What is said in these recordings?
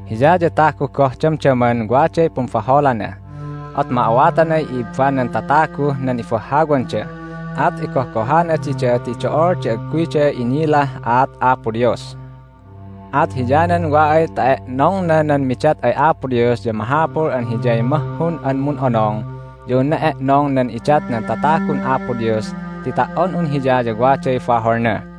Hiya ya tagu goh damdaman waday pumbaholana. At ma'awatanay i'ibbanan tataguh nan ibahhawanda, at igohgohana dida ti do'ol di agguyda inilah aat Apo Dios. At hiyanan wa ay ta e'nongna nan midat ay Apo Dios ya mahapul an hiyay mahhun an mun'onong ya unna e'nong nan idat nan tatagun Apo Dios ti ta"on un hiya ya waday baholna.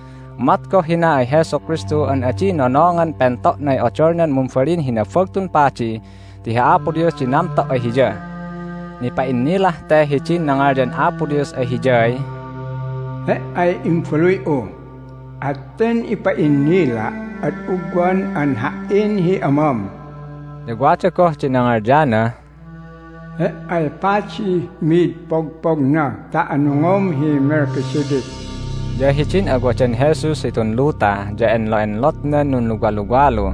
Umat goh hina ay Jesu Kristu an adi nonongan pento'nay odolnah mumbalin hi Nabagtun Padi ti hi Apo Dios di namto' ay Hiya. Nipa'innilah te hidin nangalyan Apo Dios ay Hiyay, "He"ay Imbaluy'u, at ten ipa'innila' ad ugwan an Ha"in hi Amam." Ya wada goh di nangalyanah, "He"ay padih mid pogpogna ta anungom hi Melchizedek." Ya hidin awadan Jesus hitun luta ya enlo'enlotnan nunluwaluwalu,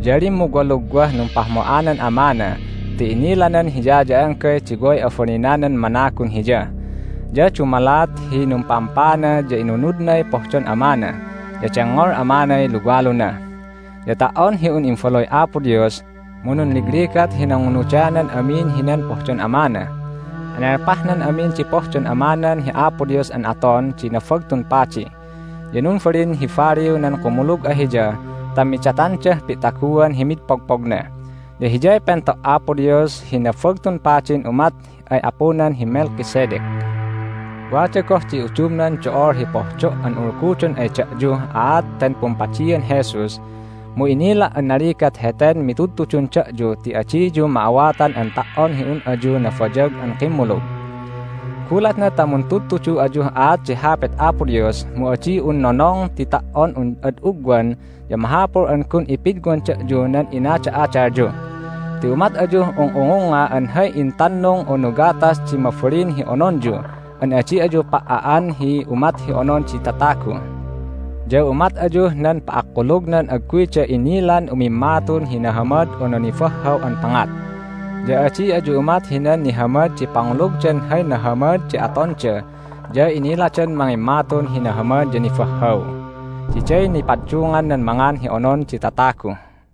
ya limmugwalugwah numpahmo'anan Amana ti inilanan Hiya ya anggay di way abalinanan managun Hiya. Ya dumalat hi numpa'ampaana ya inunudnay pohdon Amana, ya dengngol Amanay luwaluna. Ya ta"on hi un Imbaluy Apo Dios mu nunligligat hi nangunudanan amin hinan pohdon Amana. Enelpahnan amin di pohdon Amanan hi Apo Dios an aton di Nabagtun Padi, ya numbalin hi baliw nan kumulug ay Hiya ta midatandah pi'taguan hi mi'id pogpogna. Ya Hiyay pento' Apo Dios hi Nabagtun Padin umat ay apudan hi Melchizedek. Wada goh di udumnan do'ol hi pohdo' an ulgudon ay da'yuh aat ten pumpadian Jesus, mu inila' an naligat heten mitudtudun da'yu ti adiyu ma'awatan an ta"on hi un ayu nabayag an kimmulug. Gulatna ta muntudtudu ayuh aat di Hapit Apo Dios mu adi un nonong ti ta"on un ad ugwan ya mahapul an gun ipidwan da'yu nan inada'adalyu. Ti umat ayuh ung'ungungnga an hay intannung unu gatas di mabalin hi ononyu an adi ayu pa"a'an hi umat hi onon di tatagu. Ya umat ayuh nan pa'akkulugnan agguyda inilan umimmatun hi nahamad unu nibahhaw an pangat. Ya adi ayu umat hinan nihamad di pangulugdan hay nahamad di atonda ya iniladan mangimmatun hi nahamad ya nibahhaw. Diday nipaddungan nan mangan hi onon di tatagu.